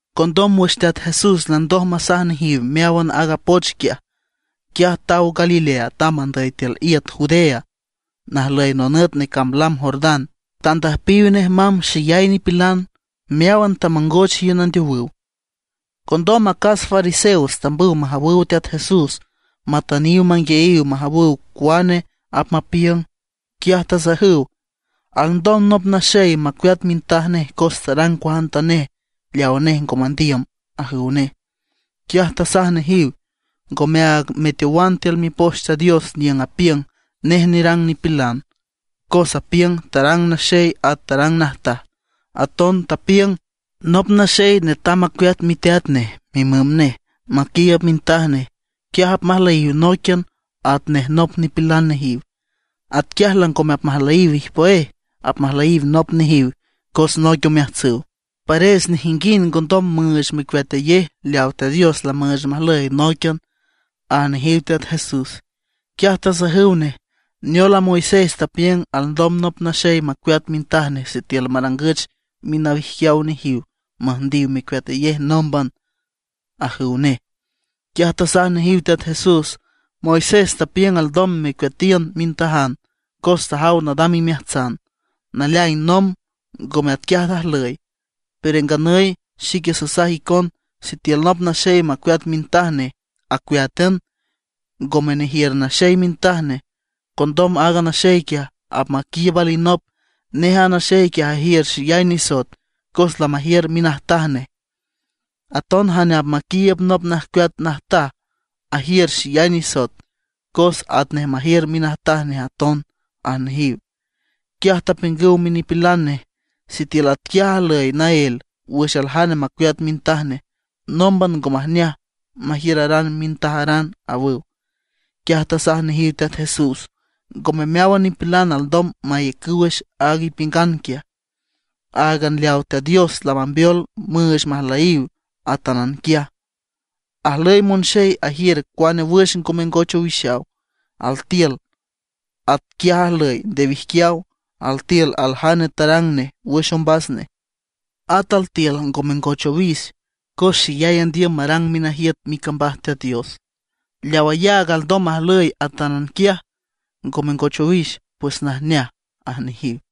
Condom wüx Teat Jesús landoj masaj nejiw meáwan aaga poch quiaj, quiaj taw Galilea tamb andüy tiül iüt Judea, najlüy nonüt necamb lam Jordán. Tandüjpiw nej mamb xeyay nipilan. Meáwan tamongoch iün andeowüw. Condom acas fariseos tambüw majawüw Teat Jesús matüntüniw manguiayiw majawüw cuane apmapiüng. Quiaj tasajüw: ―¿Alndom nop naxey macueat mintaj nej cos tarang cuajantanej leawa nej ngo mandiüm? ―ajüw nej. Quiaj tasaj nejiw: ―¿Ngomeaag meteowan tiül Mipoch Teat Dios, niüng apiüng nej nerang nipilan, cos apiüng: “Tarang naxey at tarang najtaj”? Aton tapiüng: “Nop naxey netam macueat miteat nej mimüm nej, maquiiüb mintaj nej. Quiaj apmajlüyiw nóiquian, atnej nop nipilan nejiw.” Atquiaj langome apmajlüyiw ijpüéj, apmajlüyiw nop nejiw cos noic omeajtsüw. Pares nejinguind ngondom müüch mecueatayej leaw Teat Dios lamüüch majlüy nóiquian ―aj nejiw Teat Jesús. Quiaj tasajüw nej: ―¿Neol a Moisés tapiüng alndom nop naxey macueat mintaj nej sitiül marangüch minawijquiaw nejiw müjndiw mecueatayej nómban? ―ajüw nej. Quiaj tasaj nejiw Teat Jesús: ―Moisés tapiüng alndom mecueatiün mintajan cos tajaw nadam imeajtsan. Naleaing nomb ngome atquiaj ajlüy. Pero nganüy xique sasaj icon sitiül nop naxey macueat mintaj nej, acueátan, ngome nejiür naxey mintaj nej, condom aaga naxey quiaj apmaquiiüb alinop, nej a naxey quiaj ajiür xeyay nisoet cos lamajiür minajtaj nej. Aton jane apmaquiiüb nop najcueat najtaj ajiür xeyay nisoet cos atnej majiür minajtaj nej aton ―aj nejiw. Quiaj tapiüngüw minipilan nej: ―Sitiül atquiaj ajlüy naél wüx aljane macueat mintaj nej, nómban ngo majneaj majiüraran mintajaran ―awüw. Quiaj tasaj nejiw Teat Jesús: ―Ngome meáwan nipilan alndom maiücüw wüx aaga ipiüngan quiaj. Áagan leaw Teat Dios lamambeol müüch majlüyiw atánan quiaj. Ajlüy monxey ajiür cuane wüx ngo mengoch owixaw: altiül atquiaj ajlüy nde wijquiaw; altiül aljane tarang nej wüx ombas nej; at altiül ngo mengoch owix cos xeyay andiüm marang minajiüt micambaj Teat Dios. Leaw ayaag alndom majlüy atánan quiaj, ngo mengoch owix, pues najneaj ―aj nejiw.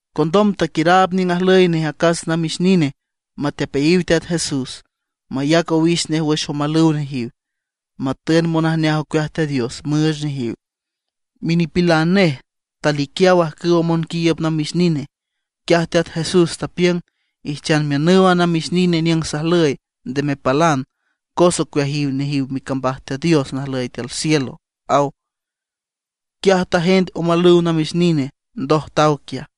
Condom taquiüraab niüng ajlüy nej acas namix nine matepeayiw Teat Jesús, mayac owix nej wüx omalüw nejiw, matün monajneaj ocueaj Teat Dios müüch nejiw. Minipilan nej taliquiaw ajcüw monquiiüb namix nine. Quiaj Teat Jesús tapiüng: ―Ijchan miünüw a namix nine niüng sajlüy, nde mepalan. Cos ocueajiw nejiw micambaj Teat Dios najlüy tiül cielo ―aw. Quiaj tajend omalüw namix nine, ndoj taw quiaj.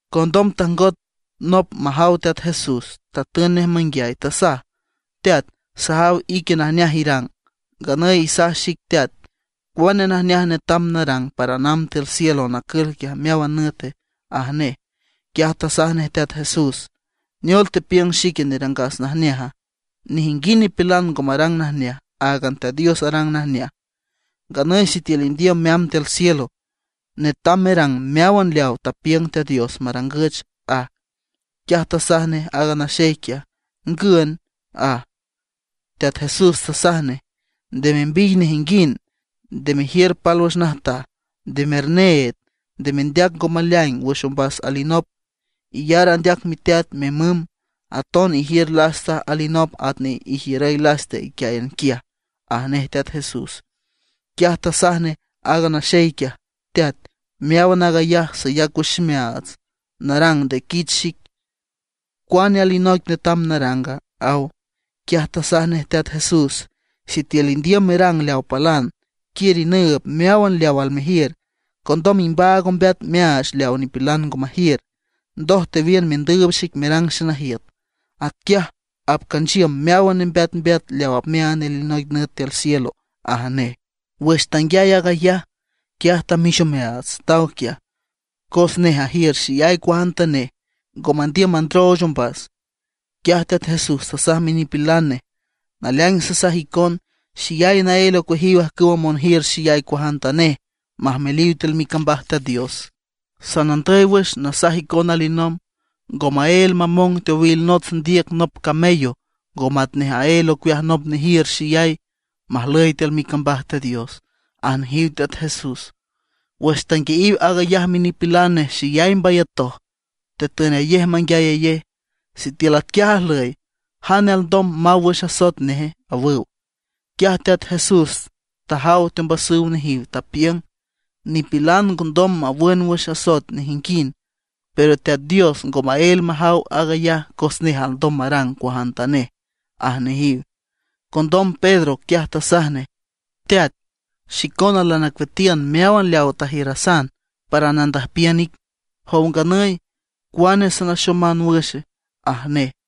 Condom tajngot nop majaw Teat Jesús, tatün nej manguiay, tasaj: ―Teat, sajaw ique najneaj irang. Nganüy isaj xic Teat, ¿cuane najneaj netam naranga para namb tiül cielo nacül quiaj meáwan nüte? ―aj nej. Quiaj tasaj nej Teat Jesús: ―¿Neol tepiüng xique nerangas najneaja? Nejinguind nipilan ngo marang najneaj. Áagan Teat Dios arang najneaj. Nganüy sitiül indiüm meamb tiül cielo, netam merang meáwan leaw tapiüng Teat Dios marangüch ―aj. Quiaj tasaj nej aaga naxey quiaj: ―¿Ngün? ―aj. Teat Jesús tasaj nej: ―Nde membiy nejinguind; nde mejiür pálwüx najtaj; nde merneed; nde mendeac ngo maleaing wüx ombas alinop; iyar andeac miteat mimüm; aton ijiür lasta alinop atnej ijiürüy lasta iquiáyan quiaj ―aj nej Teat Jesús. Quiaj tasaj nej aaga naxey quiaj: ―Teat, meáwan aag ayaj sayac wüx ximeaats narang nde quich xic. ¿Cuane alinoic netam naranga? ―aw. Quiaj tasaj nej Teat Jesús: ―Sitiül indiüm merang leaw palan, quiür inüüb meáwan leaw almejiür, condom imbaag ombeat meaach leaw nipilan ngo majiür. Ndoj tewiün mendüüb xic merang xenajiüt. Atquiaj apcanchiüm meáwan nembeatmbeat leaw apmeaand alinoic nüt tiül cielo ―aj nej. Wüx tanguiay aag ayaj, quiaj tamix omeaats, taw quiaj, cos nej ajiür xeyay cuajantanej, ngo mandiüm mandrooch ombas. Quiaj Teat Jesús tasaj minipilan nej: ―Naleaing sasaj icon xeyay naél ocueajiw ajcüwa monjiür xeyay cuajantanej majmeliw tiül micambaj Teat Dios. Sanandüy wüx nasaj icon alinomb, ngo maél mamong teowil nots ndiüc nop camello, ngo matnej aél ocueaj nop nejiür xeyay, majlüy tiül micambaj Teat Dios ―aj nejiw Teat Jesús. Wüx tanguiayiw aag ayaj minipilan nej xeyay mbayatoj, tetünayej menguiayayej: ―Sitiül atquiaj ajlüy, ¿jane alndom maw wüx asoet neje? ―awüw. Quiaj Teat Jesús tajaw teombasüw nejiw, tapiüng: ―Nipilan ngondom mawün wüx asoet nejinguind; pero Teat Dios ngo maél majaw aag ayaj cos nej alndom marang cuajantanej ―aj nejiw. Condom Pedro quiaj tasaj nej: ―Teat, xicona lanacueatiün meáwan leaw tajiürasan para nandüjpiün ic. Jow nganüy, ¿cuane sanaxoman wüx? ―aj nej.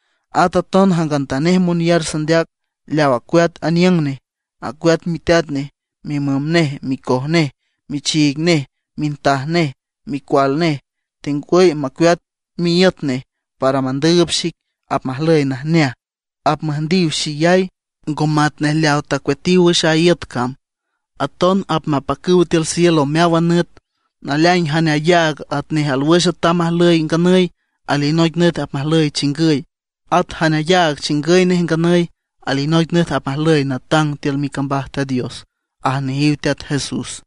At aton jangantanej monyar sandeac leaw acueat aniüng nej, acueat miteat nej, mimüm nej, micoj nej, michiig nej, mintaj nej, micual nej, tengwüy macueat miíüt nej para mandüüb xic, apmajlüy najneaj. Apmüjndiw xeyay, ngo matnej leaw tacueatiw wüx a iüt cam, aton apmapacüw tiül cielo meáwan nüt. Naleaing jane ayaag atnej alwüx atam ajlüy nganüy, alinoic nüt apmajlüy chingüy; at jane ayaag chingüy nej nganüy, alinoic nüt apmajlüy natang tiül micambaj Teat Dios ―aj nejiw Teat Jesús.